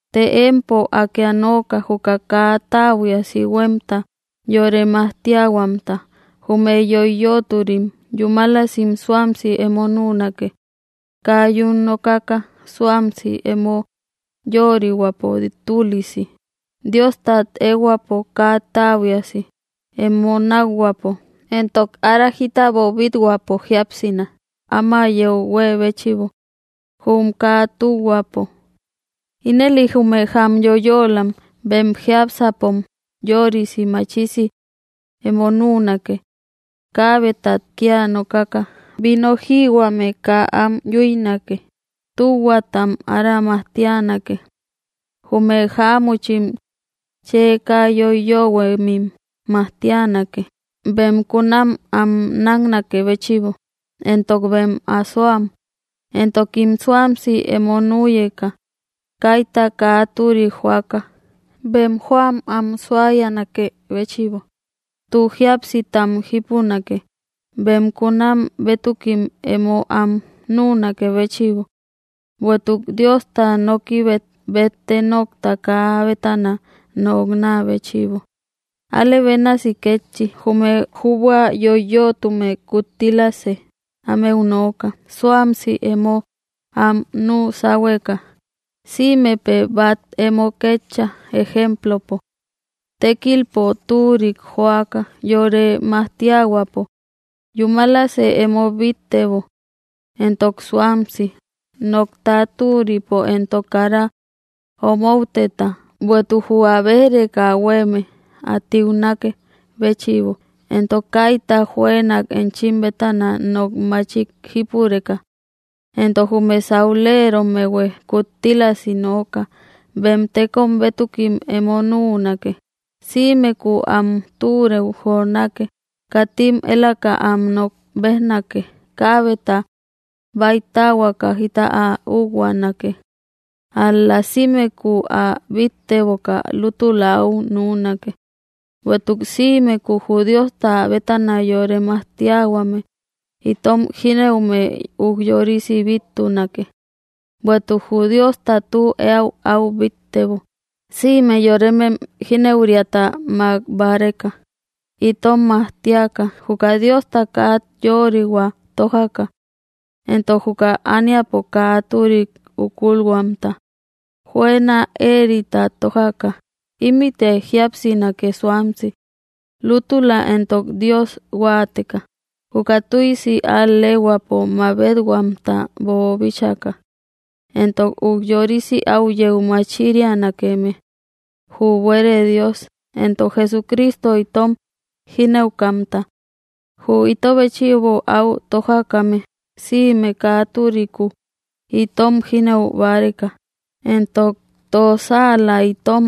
Të empo Akë ä nooka juka kaa täbuiasi huemta yore majtiahuamta. Jume yoiyöturim yúmalasim suamsi emo nünake, kaa yún nokaka, suamsi, emo yörihuäpo tülisi, Diostat ehuäpo kaa täbuiasi, emo nakhuäpo, entok ára jita böbithuäpo. Jiapsina, áma yeu huée béchïbo, jum kaa tühuapo. Ínëli jume jamyóyölam, bem jiápsäpom yörisi machisi emo nünake, kaabetat kia nokaka, vino jïhuame kaa am yuïnake, tühuatam ára majtianake; jume jáamuchim chë kaa yoiyöhuemim majtianake, bem kunam am náknakë béchïbo, éntok bem asoam, entokim suamsi emo nüyeka, kayta kaa türik joaka, bem joam am suayanakë béchïbo, tü jíapsitam jípunake, bem kunam bëtukim emo am nünakë béchïbo, bueïtuk Diosta nokibet bette nokta kaa ä bétana noknä béchïbo. Alë bénasi kétchi, jume jübua yoiyötume kuttilasë ámeu nooka: suamsi emo am nü sáhueka; sïmepë bat emo ketcha ejemplopo, tekilpo türik joaka, yore majtiahuäpo, yúmalasë emo bittebo, entok suamsi, nokta türipo entok kara omouteta, bueïtuk jü ä béj‑reka huéme ä tiunakë béchïbo, entok kaita juënak enchim bétana nok machik jípureka. Éntok jume saulerommehuë kuttílasi nooka, bem tékom bétukim emo nüunake, sïmeku am türeu jonake, katim elaka am nok bejnake; kabeta baytahuaka jita ä ühuanake, ál‑la sïmeku ä bitteboka lútula au nünake, bueïtuk sïmeku jü Diosta bétana yore majtiahuame itom jinëume üjyorisi bittunake. Bueïtuk jü Diosta tü eäu áu bittebo, sïme yoremem jínëuriata makbareka, itom majtiaka, juka Diosta kaa yörihuau tojaka, éntok juka ániapo kaa türik úkulhuamta, juëna éerita tójaka, ímïte jíapsinake suamsi, lútula entok Dios huáateka, juka tüisi al‑lehuäpo mabet-báahuamta boobíchaka, entok ujyorisi au yeu machirianakeme jü buere Dios, éntok Jesucristo itom jínëukamta, jü ito béchïbo au tojakame, sïme kaa türiku itom jínëu báreka, éntok tossaala itom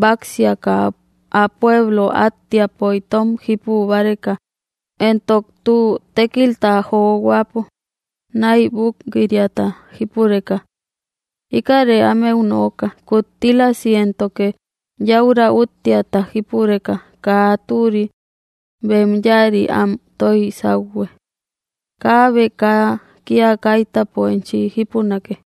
báksiaka ä pueblo attiapo itom jípu báreka, éntok tü tékilta johuäpo naybuk‑riata jípureka. Íkäre ámeu nooka, kuttílasi éntoke yäura úttiata jípureka kaa türi bem yáari am toij sauhue. Kaabe kaa kia kaitäpo enchi jipunake.